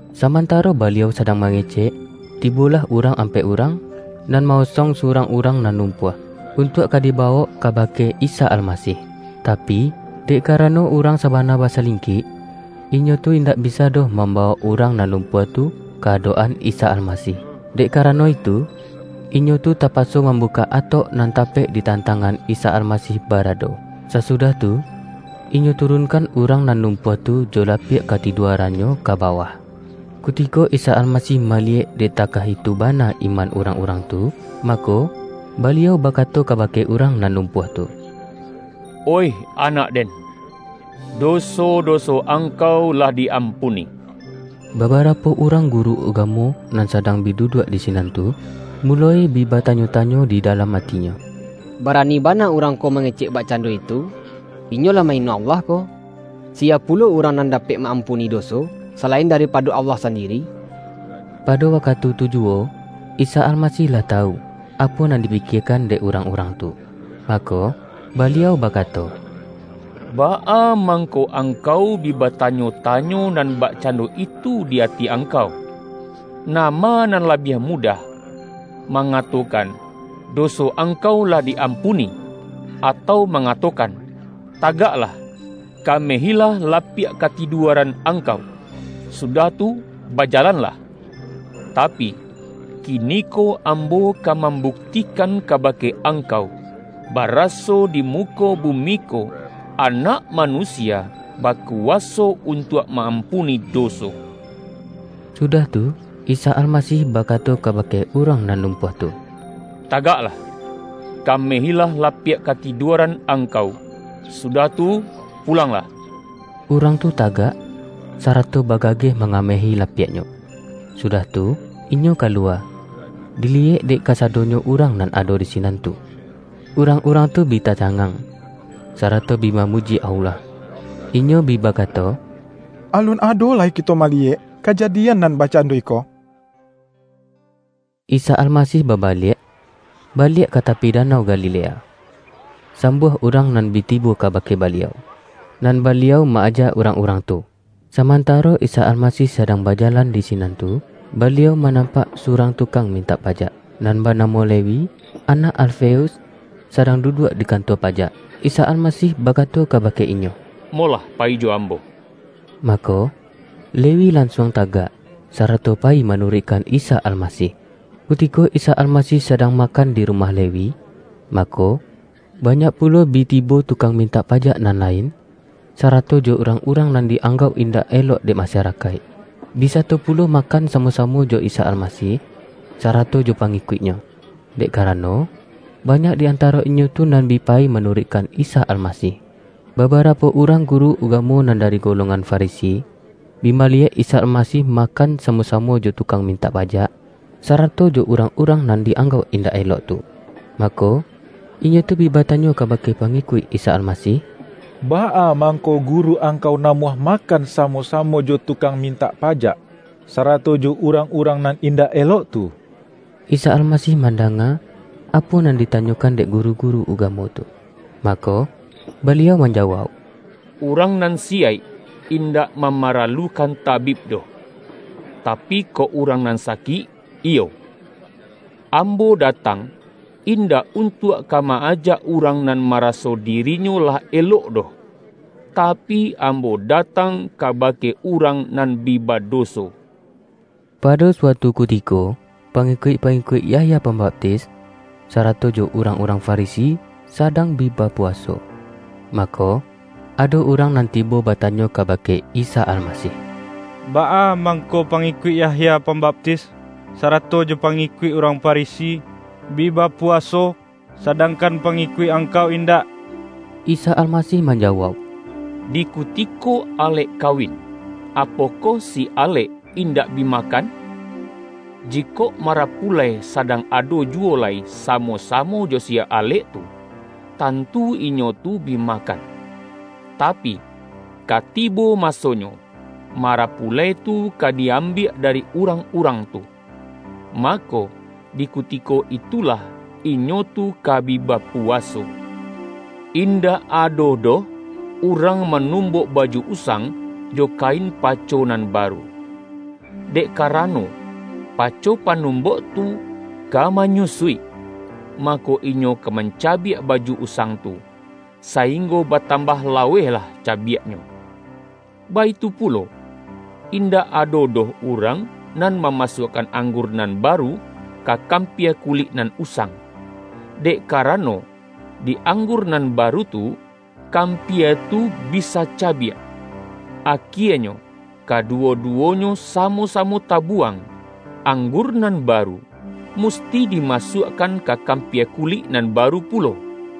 Samantaro Baliau sadang mangecek, tibolah urang ampek urang, nan ma-osong surang urang nan lum-puah, untuak ka dibawok kabake Isa Almasih. Tapi, dek karano urang sa-bana basalingkik, inyo tu indak bIsa doh mambawok urang nan lumpuah tu ka adok-an Isa Almasih. Dek kara-no itu, inyo tu tapaso mambukak atok nan tapek di tantangan Isa Almasih barado. Sasudah tu, inyo turunkan urang nan lumpuah tu jo lapiak ka-tiduarannyo ka bawah. Kutiko Isa Almasih maliyek dek takah itu bana iman urang-urang tu, mako, Baliau bakato kabake urang nan lumpuah tu,”Oih anak-Den, doso-doso angkau lah di-ampuni.” Babarapo urang guru ugamo nan sadang bi duduak di sinan tu, muloi bi batanyo-tanyo di dalam atinyo, ”Bara-ni bana Urang ko mangecek bakcando itu! Inyo lah ma-ino Allah ko. Siya pu-lo urang nan dapek ma-ampuni doso, salain daripado Allah sandiri?” Pado wakatu tu juwo, Isa Almasih lah tawu, apo nan dipikiekan dek urang-urang tu. Mako, Baliau bakato,”Baa mangko angkau bi batanyo-tanyo nan bakcando itu di ati angkau? Nama nan labiah mudah: mangatokan, ’Doso angkau lah di-ampuni', atau mangato-kan, ’Tagaklah, kamehilah lapiak kati-duaran angkau, sudah tu bajalanlah'? Tapi, kiniko Ambo ka mambuktikan kabake angkau, baraso di muko bumi ko, Anak Manusia bakuwaso untuak ma-ampuni doso.” Sudah tu, Isa Almasih bakato kabake urang nan lumpuah tu, ”Tagaklah, kamehilah lapiak katidua-ran angkau, sudah tu pulanglah!” Urang tu tagak, sarato bagageh mangamehi lapiaknyo, sudah tu, inyo kaluwa, diliyek dek kasadonyo urang nan ado di sinan tu. Urang-urang tu bi tacangang, sarato bi mamuji Allah. Inyo bi bakato,”Alun ado lai kito ma-liyek kajadian nan bakcando iko!” Isa Almasih babaliak baliak ka ta-pi danau Galilea. Sambuah urang nan bi tibo kabake Baliau, nan Baliau ma-aja urang-urang tu. Samantaro Isa Almasih sadang bajalan di sinan tu, Baliau manampak surang tukang min-tak pajak, nan banamo Lewi, anak Al-feus, sadang duduak di kantua pajak. Isa Almasih bakato kabake inyo,”Mo-lah payi jo Ambo.” Mako, Lewi lan-suang tagak, sarato payi manuruik-kan Isa Almasih. Kutiko Isa Almasih sadang makan di rumah Lewi, mako, banyak pulo bi tibo tukang mintak pajak nan lain, sa-rato jo urang-urang nan di-anggauk in-dak elok dek masarakaik, bi sato pu-lo makan samo-samo jo Isa Almasih, sarato jo pangikuik-Nyo. Dek karano, banyak di antaro inyo tu nan bi payi manuruikkan Isa Almasih. Baba-rapo urang guru ugamo nan dari go-longan Farisi, bi maliyek Isa Almasih makan samo-samo jo tukang mintak pajak, sarato jo urang-urang nan di-anggauk indak elok tu. Mako, inyo tu bi batanyo kabake pangikuik Isa Almasih,”Baa mangko Guru angkau namuah makan samo-samo jo tukang mintak pajak, sarato jo urang-urang nan indak elok tu?” Isa Almasih mandanga, apo nan ditanyokan dek guru-guru ugamo tu, mako, Baliau manjawauk,”Urang nan siyaik indak mamaralukan tabib doh; tapi, kok urang nan sakik, iyo. Ambo datang, indak untuak ka ma-ajak urang nan maraso dirinyo lah elok doh, ta-pi, Ambo datang kabake urang nan bi badoso.” Pado suatu kutiko, pangikuik-pa-ngikuik Yahya Pambaptis, sarato jo urang-urang Farisi, sadang bi bapu-waso. Mako, ado urang nan tibo bata-nyo kabake Isa Almasih,”Baa mang-ko pangikuik Yahya Pambaptis, sarato jo pangikuik urang Farisi, bi bapu-waso, sadangkan pangikuik Angkau indak?” Isa Almasih manjawauk,”Di kuti-ko alek kawin, apokoh si alek indak bi makan? Jikok marapulai sadang ado juwo lai samo-samo jo si alek tu, tan-tu inyo tu bi makan. Tapi, ka tibo masonyo marapulai tu ka di-ambiak dari urang-urang tu. Mako, di kutiko itulah, inyo tu ka bi bapuwaso. Indak ado doh urang manumbok baju usang, jo kain paco nan baru. Dek karano, paco panumbok tu ka manyu-suik, mako, inyo ka mancabiak baju usang tu, sainggo batambah lawehlah cabiaknyo. Baitu pulo, indak ado doh urang nan mamasuakkan anggur nan baru, ka kampia kulik nan usang. Dek karano di anggur nan baru tu, kam-pia tu bisa cabiak. Akienyo kaduwo-duwonyo samo-samo tabuwang. Ang-gur nan baru, musti dimasuakkan ka kampia kulik nan baru pulo!”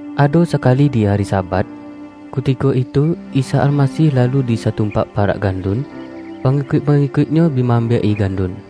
Ado sakali di ari Sabat, kutiko itu Isa Almasih lalu di satumpak parak gandun, pangikuik-pangikuik-Nyo bi ma-ambiak-i gandun.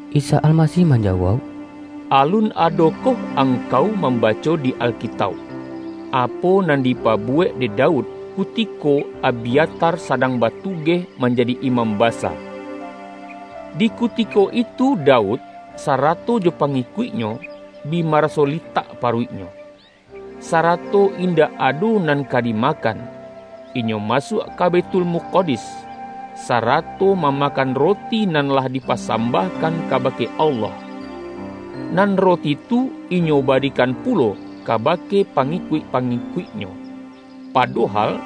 Isa Almasih manjawauk,”Alun adokoh angkau mambaco di Alkitauk, apo nan dipabuwek dek Daud, kuti-ko Abyatar sadang batugeh manjadi imam basa. Di kutiko itu Daud, sa-rato jo pangikuiknyo bi maraso litak paruiknyo, sarato indak ado nan ka dimakan, inyo masuak ka Baithul-mukadis, sarato mamakan roti nan lah dipasambahkan kabake Allah. Nan ro-ti tu inyo barikan pulo kabake pangi-kuik-pangikuiknyo. Padohal,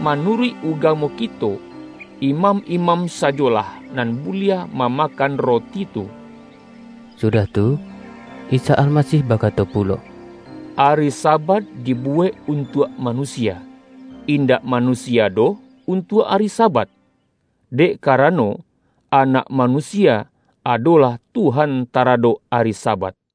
manu-ruik ugamo kito, imam-imam sajolah nan buliah mamakan roti tu.” Sudah tu, Isa Almasih bakato pulo,”Ari Sabat dibuwek untuak manusia; indak manusia doh untuak ari Sabat. Dek karano, Anak Manusia adolah Tuhan taradok ari Sabat.”